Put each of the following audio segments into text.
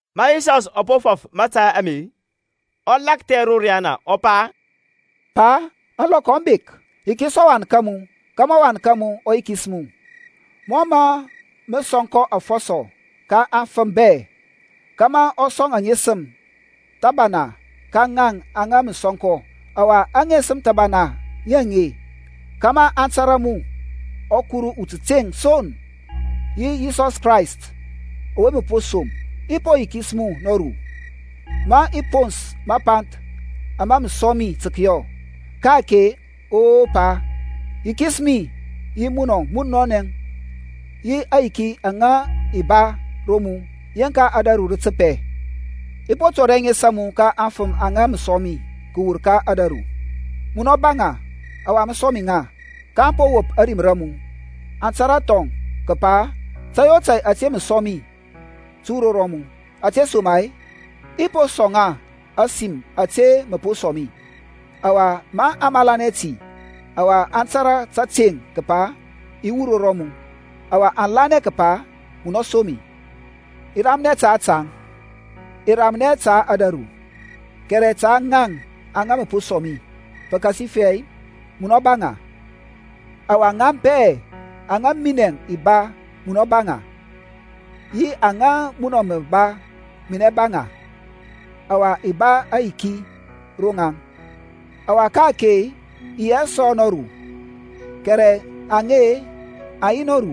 Ma Yisɔsȧŋ ɔ po fɔf mȧtȧy ame, ɔ lakthɛ ro riyana, ɔ pa, Pa, ȧŋlɔkɔ aŋ bek; yikis ɔWan ka mu, kȧmȧ ɔWan ka mu ɔ yikis mu: mɔ mȧ mə sɔŋ kɔ afɔsɔ ka afəm bɛ, kȧmȧ ɔ sɔŋ aŋesəm thəbana ka ŋaŋ aŋa mə sɔŋ kɔ. Ɔwa aŋesəm thəbana ŋi aŋe kȧmȧ aŋ tȧrȧ mu ɔKuru utəteŋ son, yi Yisɔs Krayst ɔwe mə po som. I po yikis mu nɔru, ma i pons mapanth ama mə sɔŋ mi tə kəyɔ. Ka-ake, O Pa, yikis mi yi mun munɔnɛ yi aŋyiki aŋa i ba ro mu yeŋka ȧdȧru rə təpɛ. I po tɔri ȧŋes a mu ka aŋfəm aŋa mə sɔŋ mi kəwur ka ȧdȧru: munɔ ba ŋa, ɔwa mə sɔŋ mi ŋa; kaŋ po wop ȧrim ra mu. Aŋ tȧrȧ thɔŋ kəpa tȧy o tȧy ȧte mə sɔŋ mi tə wur ro mu; ȧtesoma-e, i po sɔŋ ŋa ȧsim ȧte mə po sɔŋ mi; ɔwa aŋ malanɛ ti, ɔwa aŋ tȧrȧ tȧteŋ kəpa i wur ro mu, ɔwa aŋ lanɛ kəpa munɔ som mi. I ramnɛ taŋ, i ramnɛ hɛ ta ȧdȧru, kɛrɛ ta ŋaŋ aŋa mə po sɔŋ mi; pəkasifɛ munɔ ba ŋa: ɔwa ŋaŋ bɛ aŋa minɛŋ i ba munɔ ba ŋa, yi aŋa munɔ mə ba minɛ ba ŋa: ɔwa i ba ayiki ro ŋaŋ. Ɔwa ka-ake i yi hɛ sɔ nɔru, kɛrɛ aŋe aŋ yi nɔru,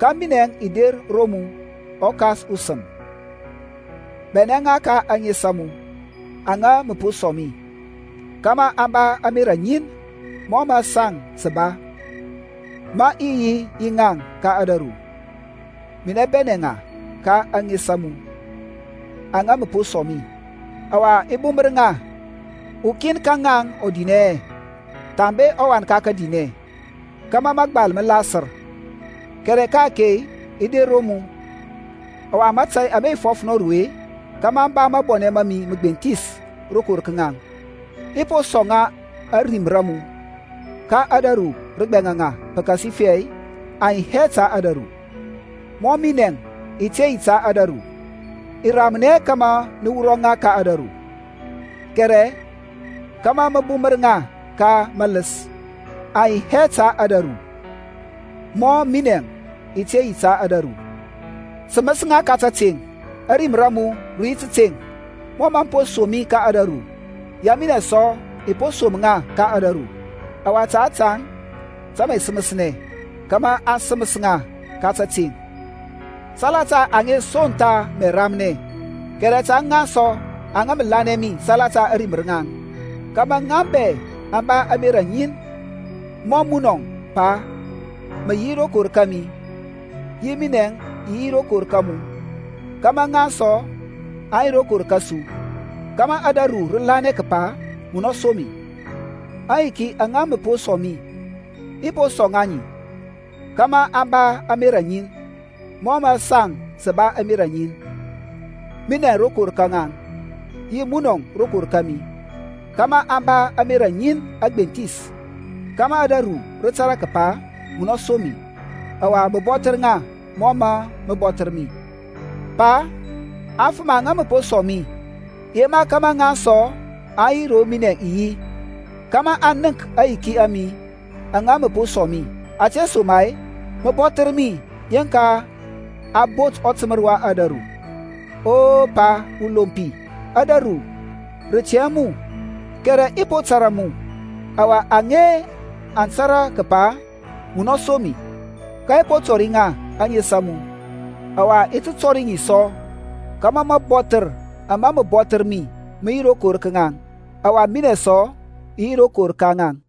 ka minɛ i der ro mu. ƆKas usəm, bɛnɛ ŋa ka ȧŋes a mu, aŋa mə po sɔŋ mi, kȧmȧ aŋ ba ȧmerȧ ŋin mɔ mə saŋ sə ba. Ma i yi yi ŋaŋ ka ȧdȧru, minɛ bɛnɛ ŋa ka ȧŋes a mu, aŋa mə po sɔŋ mi: ɔwa i bumər ŋa, ukin ka ŋaŋ ɔ dinɛ hɛ, thambe ɔwan ka kədinɛ; kȧmȧ mȧgbal mə lasər. Kɛrɛ ka-ake i der ro mu; ɔwa mȧtȧy ame i fɔf nɔru-e, kȧmȧ aŋ ba mabɔnɛ ma mi məgbenthis rokor ka ŋaŋ. I po sɔŋ ŋa ȧrim ra mu, ka ȧdȧru rə gbɛŋa ŋa, pəkasifɛ aŋ yi hɛ ta ȧdȧru, mɔ minɛ i te yi ta ȧdȧru. I ramnɛ hɛ kȧmȧ mə wurɔ ŋa ka ȧdȧru, kɛrɛ kȧmȧ mə bumər ŋa ka maləs. Aŋ yi hɛ ta ȧdȧru, mɔ minɛŋ i te yi ta ȧdȧru. Səməs ŋa ka tȧteŋ, ȧrim ra mu rə yi tȧteŋ. Mɔ mə po som mi ka ȧdȧru, yɛ minɛŋ sɔ i po som ŋa ka ȧdȧru. Ɔwa ta ȧtȧŋ tə mə i səməsnɛ, kȧmȧ a səməs ŋa ka tȧteŋ. Salata aŋe son tha mə i ramnɛ, kɛrɛ ta ŋaŋ sɔ aŋa mə lanɛ mi salata ȧrim ra ŋaŋ; kȧmȧ ŋaŋ bɛ aŋ ba ȧmerȧ ŋin; mɔ munɔŋ, Pa, mə yi rokor kȧmi, yi minɛŋ i yi rokor ka mu, kȧmȧ ŋaŋ sɔ aŋ yi rokor kȧsu: kȧmȧ ȧdȧru rə lanɛ kəpa munɔ som mi. Aŋyiki aŋa mə po sɔŋ mi, i po sɔŋ ŋa ŋi, kȧmȧ aŋ ba ȧmerȧ ŋin, mɔ mə saŋ sə ba ȧmerȧ ŋin; minɛŋ rokor ka ŋaŋ, yi munɔŋ rokor kȧmi, kȧmȧ aŋ ba ȧmerȧ ŋin agbenthis; kȧmȧ ȧdȧru rə tȧrȧ kəpa munɔ som mi, ɔwa mə bɔthər ŋa mɔ mȧ mə bɔthər mi. Pa, aŋfəm aŋa mə po sɔŋ mi, i yema kȧmȧ ŋaŋ sɔ aŋ yi ro minɛŋ i yi; kȧmȧ aŋ nənk aŋyiki a mi aŋa mə po sɔŋ mi: ȧtesoma-e mə bɔthər mi yeŋka a bot ɔtəmər wa ȧdȧru. O, Pa ulompi, ȧdȧru rə tɛ hɛ mu, kɛrɛ i po tȧrȧ mu, ɔwa aŋe aŋ tȧrȧ kəpa munɔ som mi. Ka i po tɔri ŋa ȧŋes a mu ɔwa i ti tɔri ŋi sɔ: kȧmȧ mabɔthər ama mə bɔthər mi mə yi rokor ka ŋaŋ, ɔwa minɛŋ sɔ i yi rokor ka ŋaŋ.